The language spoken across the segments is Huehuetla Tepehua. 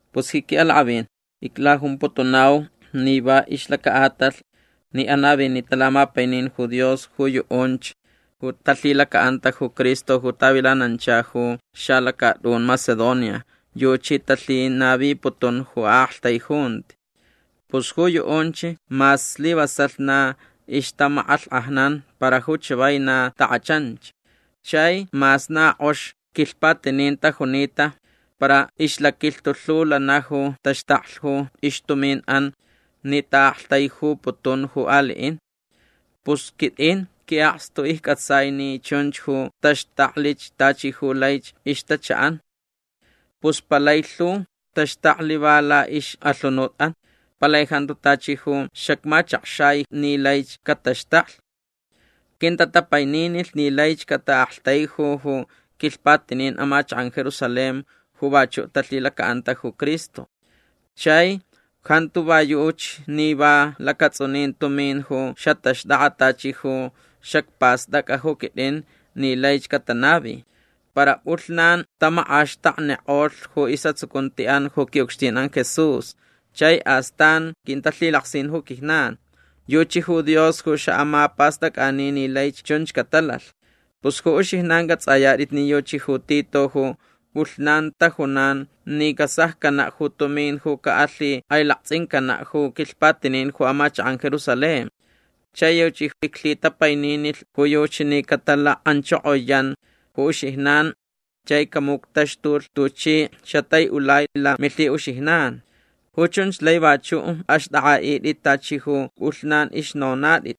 Pus ji qui'alak'avin iclajumputunau ni va ixlaca'atalh ni anavinita lamapainin ju Dios ju yu'unch ju talhilaca'anta ju Cristo ju tavilanancha ju xalacat'un Macedonia yuchi talhinaviputun ju a'aktaijunti. Pus ju yu'unch mas slivasalh na ixtamak'alhk'ajnan para ju chavai na tak'achanch. Chai mas na k'ox quilhpatinin tajunita para ixlaquilhtu lhu lana ju taxtaklh ju ixtumin'an ni ta'aktaijuputun ju ali'in. Pus quit'in qui'akstu icc'atsai ni chunch ju taxtaklich tachi ju laich ixtacha'an. Pus palai lhu taxtaklh va la'ix'alhunut'an. Palai jantu tachi ju xacmachakxai ni laich cataxtaklh. Quintatapaininilh ni laich cata'aktaiju ju quilhpatinin amachak'an Jerusalén ju vachu' talhilaca'anta ju Cristo. Chai jantu va yuchi ni va lacats'unin tumin ju xataxt'ak'a tachi ju xacpast'ac'a ju quit'in ni laich catanavi. Para p'ulhnan tamak'axtaknik'olh ju is'atsucunti'an ju qui'ucxtin'an Jesús chai astan quintalhilaksin ju quijnan. Yuchi ju Dios ju xa'amapast'ac'ani ni laich chunch catalalh. Pus ju uxijnan c'ats'ayat'it ni yuchi ju Tito ju p'ulhnan tajunan ni casaccana' ju tumin ju ca'alhik'ailakts'incana' ju quilhpatinin ju amachak'an Jerusalén. Chai yuchi iclhitapaininilh ju yuchi ni catalak'anchokoyan ju uxijnan chai camuctaxtulh tuchi xatai'ulai lamilhi'uxijnan. Ju chunch laich vachu' axt'ak'a'it'it tachi ju p'ulhnan ixnonat'it.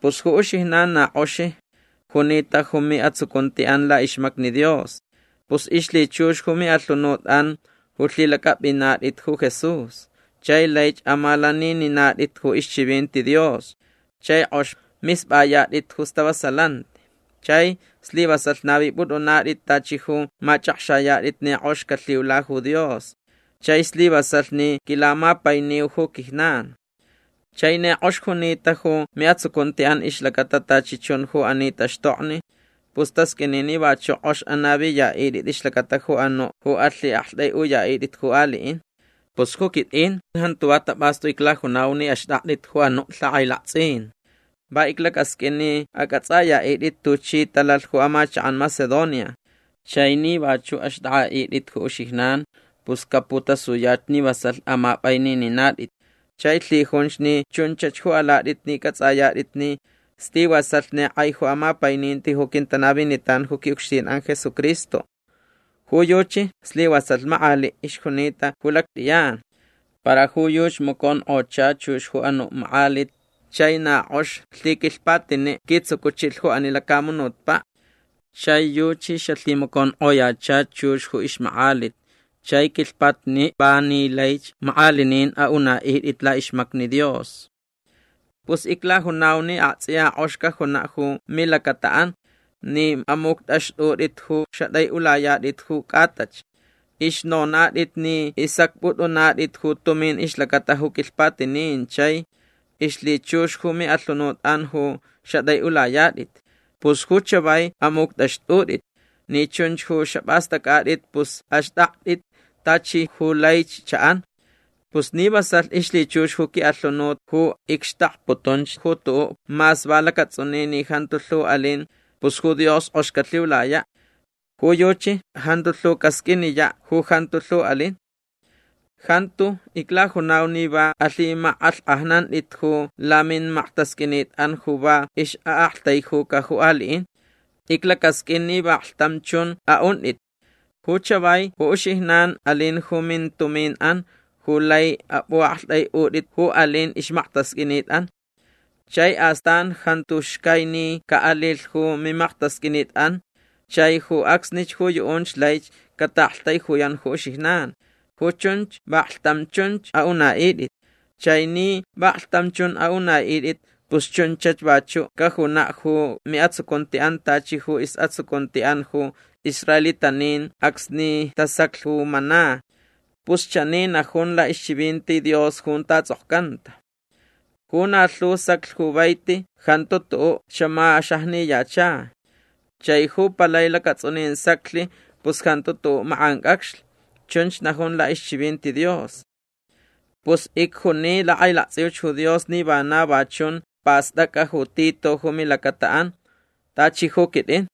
Pus ju uxijnan na k'ox junita ju mi'atsucunti'an la'ixmacni Dios. Pus ixlhichux ju mi'alhunut'an ju lhilac'ap'inat'it ju Jesús. Chai laich amalanininat'it ju ixchivinti Dios. Chai k'ox misp'ayat'it ju stavasalanti. Chai slivasalh navip'ut'unat'it tachi ju mach'akxayat'it ni k'ox calhiula ju Dios. Chai slivasalh ni quilamapainiu ju quijnan. Chai ni k'ox junita ju mi'atsucunti'an ixlacata tachi chun ju ani taxtokni pus tasq'uini ni vachu' k'ox anaviya'it'it ixlacata ju anu' ju alhi'akt'ai'uya'it'it ju ali'in. Pus ju quit'in jantu va tap'astu iclajunau ni axt'akt'it ju anu' lhak'ailakts'in. Va iclacasq'uin ni ac'ats'aya'it'it tuchi talalh ju amachak'an Macedonia. Chai ni vachu' axt'ak'a'it'it ju uxijnan pus caputasuyach ni vasalh amap'ainininat'it. Chai lhijunch ni chunchach ju alat'it ni c'ats'ayat'it ni slivasalh ni k'ai ju amapaininti ju quintanavinitan ju qui'ucxtin'an Jesucristo. Ju yuchi slivasalh mak'ali' ixjunita ju lact'iyan. Para ju yuchi maconk'ocha chux ju anu' mak'alit chai na k'ox lhiquilhpatini' quitsucuchilh ju ani lacamunutpa'. Chai yuchi xalhimaconk'oyacha chux ju ixmak'alit chai quilhpatini' va ni laich mak'alinin a'una'it'it la'ixmacni Dios. Pus iclajunau ni akts'iya k'ox cajuna' ju milacata'an ni amuct'axt'ut'it ju xat'ai'ulayat'it ju c'atach. Ixnonat'it ni isacp'ut'unat'it ju tumin ixlacata ju quilhpatinin chai ixlhichux ju mi'alhunut'an ju xat'ai'ulayat'it. Pus ju chavai amuct'axt'ut'it. Ni chunch ju xap'ast'ac'at'it pus axt'akt'it tachi ju laich cha'an. Pus ni vasalh ixlhichux ju qui'alhunut ju icxtakputunch ju tu'u' mas va lacats'unin ni jantu lhu alin pus ju Dios k'ox calhiulaya'. Ju yuchi jantu lhu casq'uiniya' ju jantu lhu alin. Jantu iclajunau ni va alhimak'alhk'ajnant'it ju lamimaktasq'uinit'an ju va ix'a'aktaijuca ju ali'in. Iclacasq'uin ni vaklhtam chun a'unt'it. Ju chavai ju uxijnan alin ju mintumin'an ju lai ap'u'akt'ai'ut'it ju alin ixmaktasq'uinit'an. Chai astan jantu xcai ni ca'alilh ju mimaktasq'uinit'an chai ju acsnich ju yu'unch laich cata'aktaijuyan ju uxijnan. Ju chunch vaklhtam chunch a'una'it'it. Chai ni vaklhtam chun a'una'it'it pus chunchach vachu' cajuna' ju mi'atsucunti'an tachi ju is'atsucunti'an ju israelitanin acsni tasaclh ju mana. Pus chani najun la'ixchivinti Dios junta ts'okcanta: “Ju na lhu saclh ju vaiti jantu tu'u' xamaxajniyacha. Chai ju palai lacats'unin saclh pus jantu tu'u' mak'anc'acxlh”. Chunch najun la'ixchivinti Dios. Pus icjuni lak'ailakts'iuch ju Dios ni vana va chunch past'ac'a ju Tito ju milacata'an tachi ju quit'in.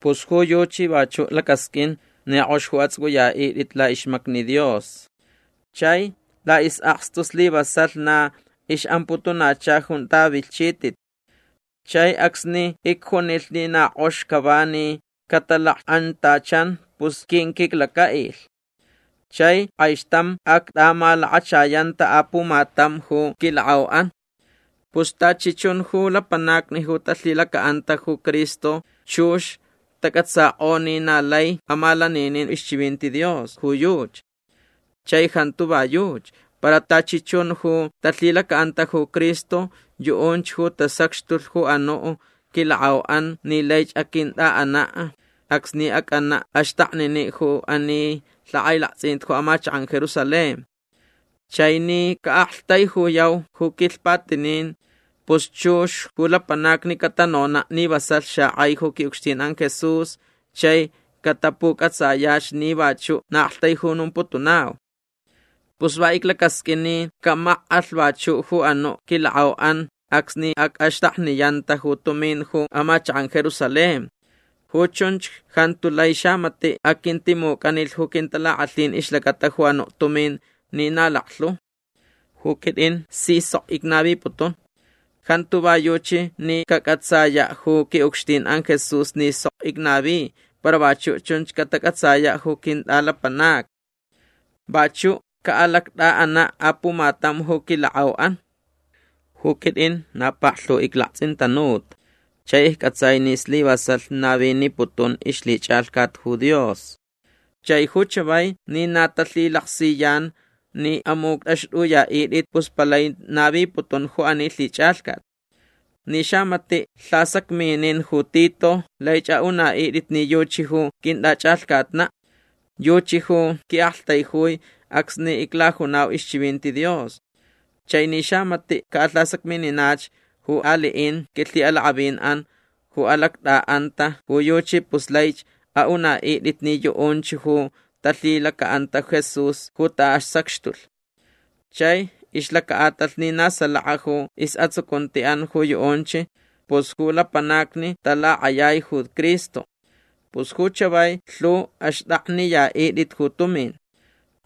Pus ju yuchi vachu' lacasq'uin ni k'ox ju ats'uc'uya'it'it la'ixmacni Dios. Chai la'is'akstu slivasalh na ix'amputunacha junta vilhchit'it. Chai acsni icjunilh ni na k'ox cava ni catalak'antachan pus quinquiclaca'ilh. Chai k'aixtam act'amalakachayanta apumatam ju quilak'au'an. Pus tachi chun ju lapanacni ju talhilaca'anta ju Cristo chux tac'atsak'o ni na lai amalaninin ixchivinti Dios ju yuchi. Chai jantu va yuchi. Para tachi chun ju talhilaca'anta ju Cristo yu'unch ju tasacxtulh ju anu' quilak'au'an ni laich aquint'a'ana' acsni ac'ana' axtaknini' ju ani lhak'ailakts'in ju amachak'an Jerusalén. Chai ni ca'aktaijuyau ju quilhpatinin pus chux ju lapanacni catanona' ni vasalh xak'ai ju qui'ucxtin'an Jesús chai catapuc'atsayach ni vachu' na a'aktaijunumputunau. Pus va iclacasq'uin ni camak'alh vachu' ju anu' quilak'au'an acsni ac'axtakniyanta ju tumin ju amachak'an Jerusalén. Ju chunch jantu lai xamati' aquintimuc'anilh ju quintalak'alhin ixlacata ju anu' tumin ni na laklhu. Ju quit'in si sok icnaviputun. Jantu va yuchi ni cac'atsaya' ju qui'ucxtin'an Jesús ni sok icnavi para vachu' chunch catac'atsa ju quint'alapanacni. Vachu' ca'alact'a'ana' apumatam ju quilak'au'an. Ju quit'in na paklhu iclakts'intanuta chai icc'atsai ni slivasalh naviniputun ixlhich'alhcat ju Dios. Chai ju chavai ni na talhilaksiyan ni amuct'axt'uya'it'it pus palai naviputun ju ani lhich'alhcat. Ni xamati' lhasacminin ju Tito laich a'una'it'it ni yuchi ju quint'ach'alhcatna'. Yuchi ju qui'aktaijui acsni iclajunau ixchivinti Dios. Chai ni xamati' ca'alhasacmininach ju ali'in quilhi'alak'avin'an ju alact'a'anta ju yuchi pus laich a'una'it'it ni yu'unch ju talhilaca'anta Jesús ju ta'asacxtulh. Chai ixlaca'atalh ni na salaka ju is'atsucunti'an ju yu'unch pus ju lapanacni talak'ayai ju Cristo. Pus ju chavai lhuch axt'akniya'it'it ju tumin.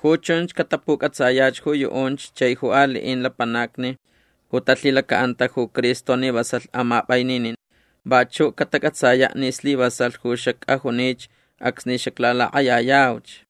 Ju chunch catapuc'atsayach ju yu'unch chai ju ali'in lapanacni ju talhilaca'anta ju Cristo ni vasalh amap'aininin. Vachu' catac'atsaya' ni slivasalh ju xac'ajunich acsni xaclalak'ayayauch.